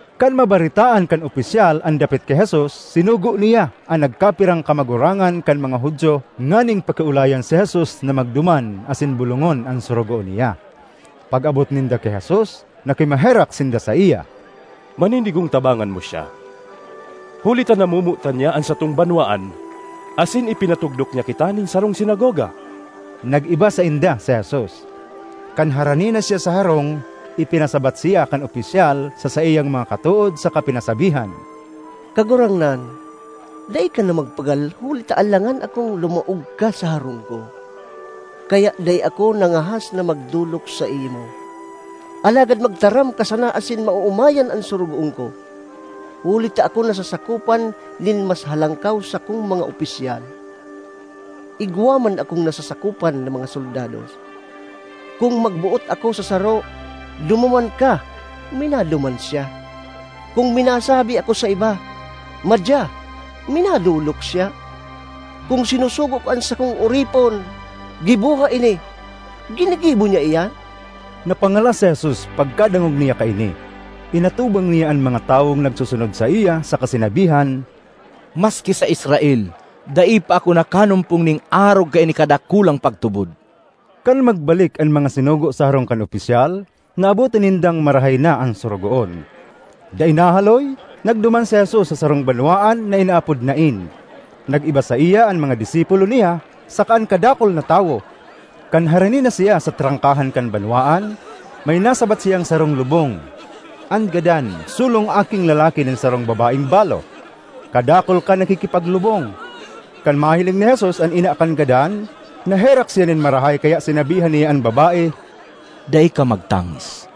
Kan mabaretaan kan opisyal an dapit ki Jesus, sinugo niya an nagkapirang kamagurangan kan mga Judio nganing pakiolayan si Jesus na magduman asin bolongon an sorogoon niya. Pag-abot ninda ki Jesus nakimaherak sinda saiya, “Maninigong tabangan mo siya, huli ta namomotan niya an satong banwaan asin ipinatugdok niya kita nin sarong sinagoga.” Nag-iba sainda si Jesus. Kan harani na siya sa harong, ipinasabat siya kan opisyal sa saiyang mga katood saka pinasabihan, “Kagurangnan, dai ka na magpagal huli ta alangan akong lumaog ka sa harong ko; kaya dai ako nangahas na magdolok saimo. Alagad magtaram ka sana asin maoomayan an sorogoon ko. Huli ta ako nasasakopan nin mas halangkaw sakong mga opisyal; igwa man akong nasasakopan na mga soldados. Kun magboot ako sa saro, ‘Dumuman ka!’ minaduman siya; kun minasabi ako sa iba, ‘Madya!’ minadolok siya. Kun sinusugo ko an sakong oripon, ‘Giboha ini!’ ginigibo niya iyan.” Napangalas si Jesus pagkadangog niya kaini; inatubang niya an mga tawong nagsusunod saiya saka sinabihan, “Maski sa Israel dai pa ako nakanumpong nin arog kaini kadakulang pagtubod!” Kan magbalik an mga sinugo sa harong kan opisyal, naabotan nindang marahay na an sorogoon. Dai nahaloy, nagduman si Jesus sa sarong banwaan na inaapod Nain. Nag-iba saiya an mga disipulo niya saka an kadakul na tawo. Kan harani na siya sa trangkahan kan banwaan, may nasabat siyang sarong lubong. An gadan solong aking lalaki nin sarong babaeng balo. Kadakul kan nakikipaglubong. Kan mahiling ni Jesus an ina kan gadan, naherak siya nin marahay kaya sinabihan niya an babae, “Dai ka magtangis.”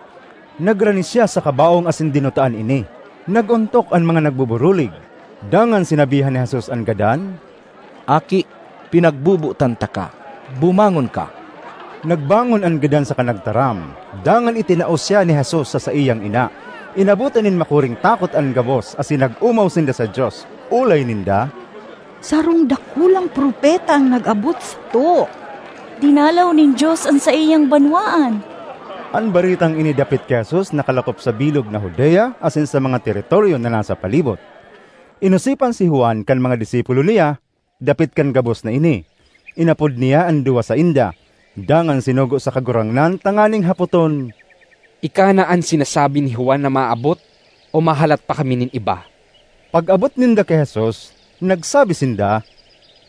Nagrani siya sa kabaong asin dinutaan ini. Nag-ontok an mga nagbuburulig. Dangan sinabihan ni Jesus an gadan, “Aki, pinagbobotan taka, bumangon ka!” Nagbangon an gadan saka nagtaram, dangan itinao siya ni Jesus sa saiyang ina. Inabotan nin makuring takot an gabos asin nag-omaw sinda sa Dios. Olay ninda, “Sarong dakulang propeta an nag-abot sato! Dinalaw nin Dios an saiyang banwaan!” An baretang ini dapit ki Jesus nakalakop sa bilog na Judea asin sa mga teritoryo na nasa palibot. Inosipan si Juan kan mga disipulo niya dapit kan gabos na ini. Inapod niya an duwa sainda, dangan sinugo sa Kagurangnan tanganing hapoton, “Ika na an sinasabi ni Juan na maabot o mahalat pa kami nin iba?” Pag-abot ninda ki Jesus, nagsabi sinda,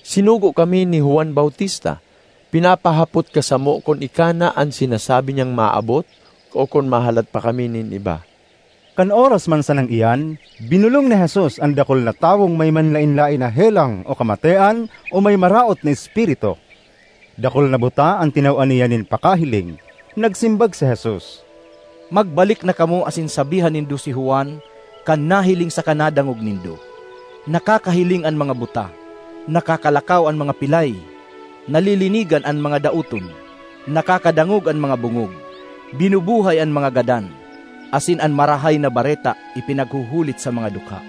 “Sinugo kami ni Juan Bautista. Pinapahapot ka samo kun ika na an sinasabi niyang maabot o kun mahalat pa kami nin iba?” Kan oras man sanang iyan, binolong ni Jesus an dakul na tawong may manlaen-laen na helang o kamatean o may maraot na espiritu; dakul na buta an tinawan niya nin pakahiling. Nagsimbag si Jesus, “Magbalik na kamo asin sabihan nindo si Juan kan nahiling saka nadangog nindo: nakakahiling an mga buta, nakakalakaw an mga pilay, nalilinigan an mga daoton, nakakadangog an mga bongog, binubuhay an mga gadan, asin an Marahay na Bareta ipinaghuhulit sa mga dukha.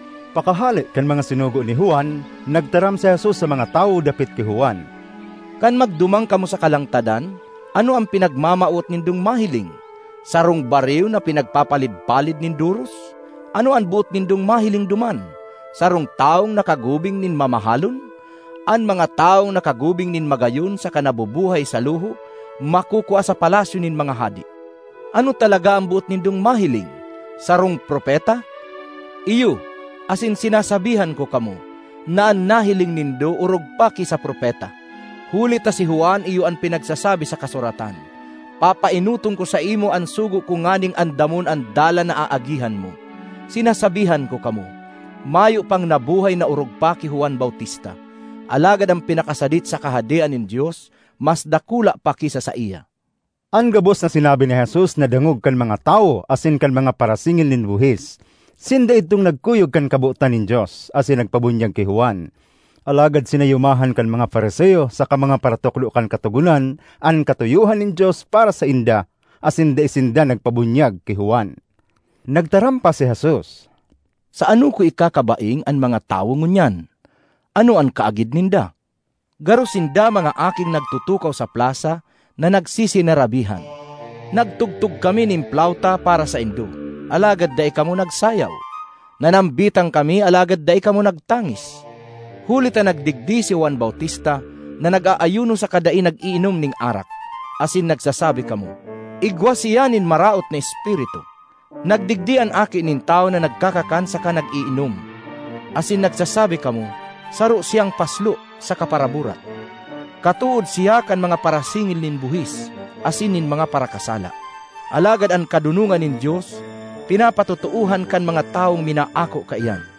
Pakahale kan mga sinugo ni Juan, nagtaram si Jesus sa mga tawo dapit ki Juan, “Kan magduman kamo sa kalangtadan, ano an pinagmamawot nindong mahiling? Sarong bariw na pinagpapalid-palid nin doros? Ano an boot nindong mahiling duman? Sarong tawong nakagubing nin mamahalon? An mga tawong nakagubing nin magayon saka nabubuhay sa luho makukua sa palasyo nin mga hade! Ano talaga an boot nindong mahiling? Sarong propeta? Iyo, asin sinasabihan ko kamo na an nahiling nindo orog pa ki sa propeta. Huli ta si Juan iyo an pinagsasabi sa kasuratan, ‘Papaenoton ko saimo an sugo ko nganing andamon an dalan na aagihan mo.’ Sinasabihan ko kamo, mayo pang nabuhay na orog pa ki Juan Bautista; alagad an pinakasadit sa Kahadean nin Dios mas dakula pa ki sa saiya.” An gabos na sinabi ni Jesus nadangog kan mga tawo asin kan mga parasingil nin buhis. Sinda idtong nagkuyog kan kabotan nin Dios, asin nagpabunyag ki Juan. Alagad sinayumahan kan mga Fariseo saka mga paratukdo kan Katogonan an katuyohan nin Dios para sainda asin dai sinda nagpabunyag ki Juan. Nagtaram pa si Jesus, “Sa ano ko ikakabaing an mga tawo ngunyan? Ano an kaagid ninda? Garo sinda mga aking nagtutukaw sa plasa na nagsisinarabihan, ‘Nagtugtog kami nin plauta para saindo, alagad dai kamo nagsayaw! Nanambitan kami alagad dai kamo nagtangis!’ Huli ta nagdigdi si Juan Bautista na nag-aayuno saka dai nag-iinom nin arak, asin nagsasabi kamo, ‘Igwa siya nin maraot na espiritu!’ Nagdigdi an Aki nin Tawo na nagkakakan saka nag-iinom, asin nagsasabi kamo ‘Saro siyang paslo saka paraburat; katood siya kan mga parasingil nin buhis asin nin mga parakasala!’ Alagad an kadonongan nin Dios pinapatotoohan kan mga tawong minaako kaiyan.”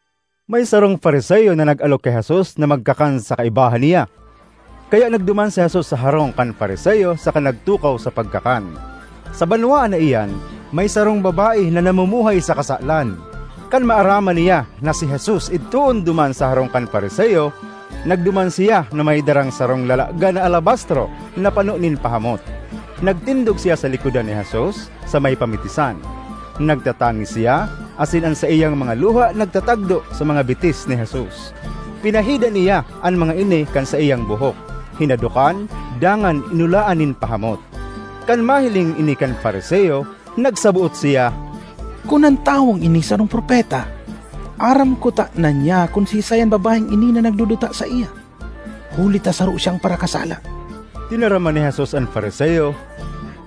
May sarong Fariseo na nag-alok ki Jesus na magkakan sa kaibahan niya. Kaya nagduman si Jesus sa harong kan Fariseo saka nagtukaw sa pagkakan. Sa banwaan na iyan may sarong babae na namumuhay sa kasalan. Kan maaraman niya na si Jesus idtoon duman sa harong kan Fariseo, nagduman siya na may darang sarong lalagan na alabastro na pano nin pahamot. Nagtindog siya sa likodan ni Jesus, sa may pamitisan. Nagtatangis siya asin an saiyang mga luha nagtatagdo sa mga bitis ni Jesus; pinahidan niya an mga ini kan saiyang buhok, hinadokan dangan inulaan nin pahamot. Kan mahiling ini kan Fariseo, nagsaboot siya, “Kun an tawong ini sarong propeta, aram kutana niya kun siisay an babaeng ini na nagduduta saiya, huli ta saro siyang parakasala.” Tinaraman ni Jesus an Fariseo,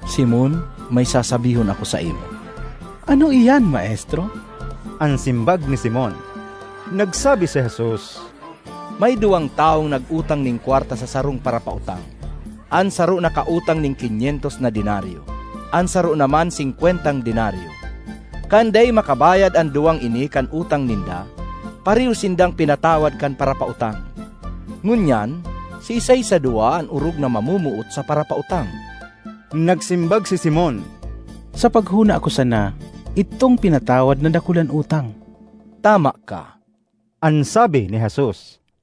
“Simon, may sasabihon ako saimo.” “Ano iyan maestro?” an simbag ni Simon. Nagsabi si Jesus, “May duwang tawong nag-utang nin kwarta sa sarong parapautang. An saro nakautang nin kinyentos na denaryo, an saro naman singkwentang denaryo. Kan dai makabayad an duwang ini kan utang ninda, pareho sindang pinatawad kan parapautang. Ngunyan, siisay sa duwa an orog na mamomoot sa parapautang?” Nagsimbag si Simon, “Sa paghona ko sana, idtong pinatawad na dakul an utang.” “Tama ka!” an sabi ni Jesus.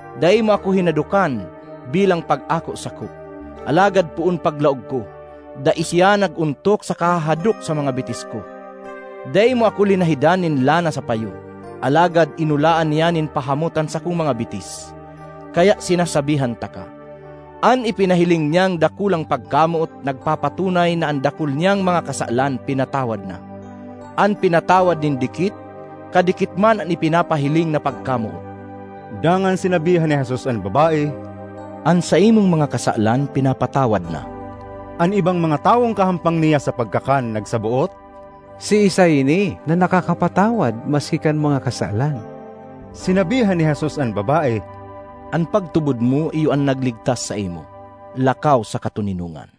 Dai mo ako hinadokan bilang pag-ako sako, alagad poon paglaog ko, dai siya nag-ontok sa kahahadok sa mga bitis ko. Dai mo ako linahidan nin lana sa payo, alagad inulaan niya nin pahamot an sakong mga bitis. Kaya sinasabihan taka, an ipinahiling niyang dakulang pagkamoot nagpapatunay na an dakul niyang mga kasalan pinatawad na. An pinatawad nin dikit, kadikit man an ipinapahiling na pagkamoot.” Dangan sinabihan ni Jesus an babae, “An saimong mga kasalan pinapatawad na.” An ibang mga tawong kahampang niya sa pagkakan nagsaboot, “Siisay ini na nakakapatawad maski kan mga kasalan?” Sinabihan ni Jesus an babae, “An pagtubod mo iyo an nagligtas saimo; lakaw sa katoninongan.”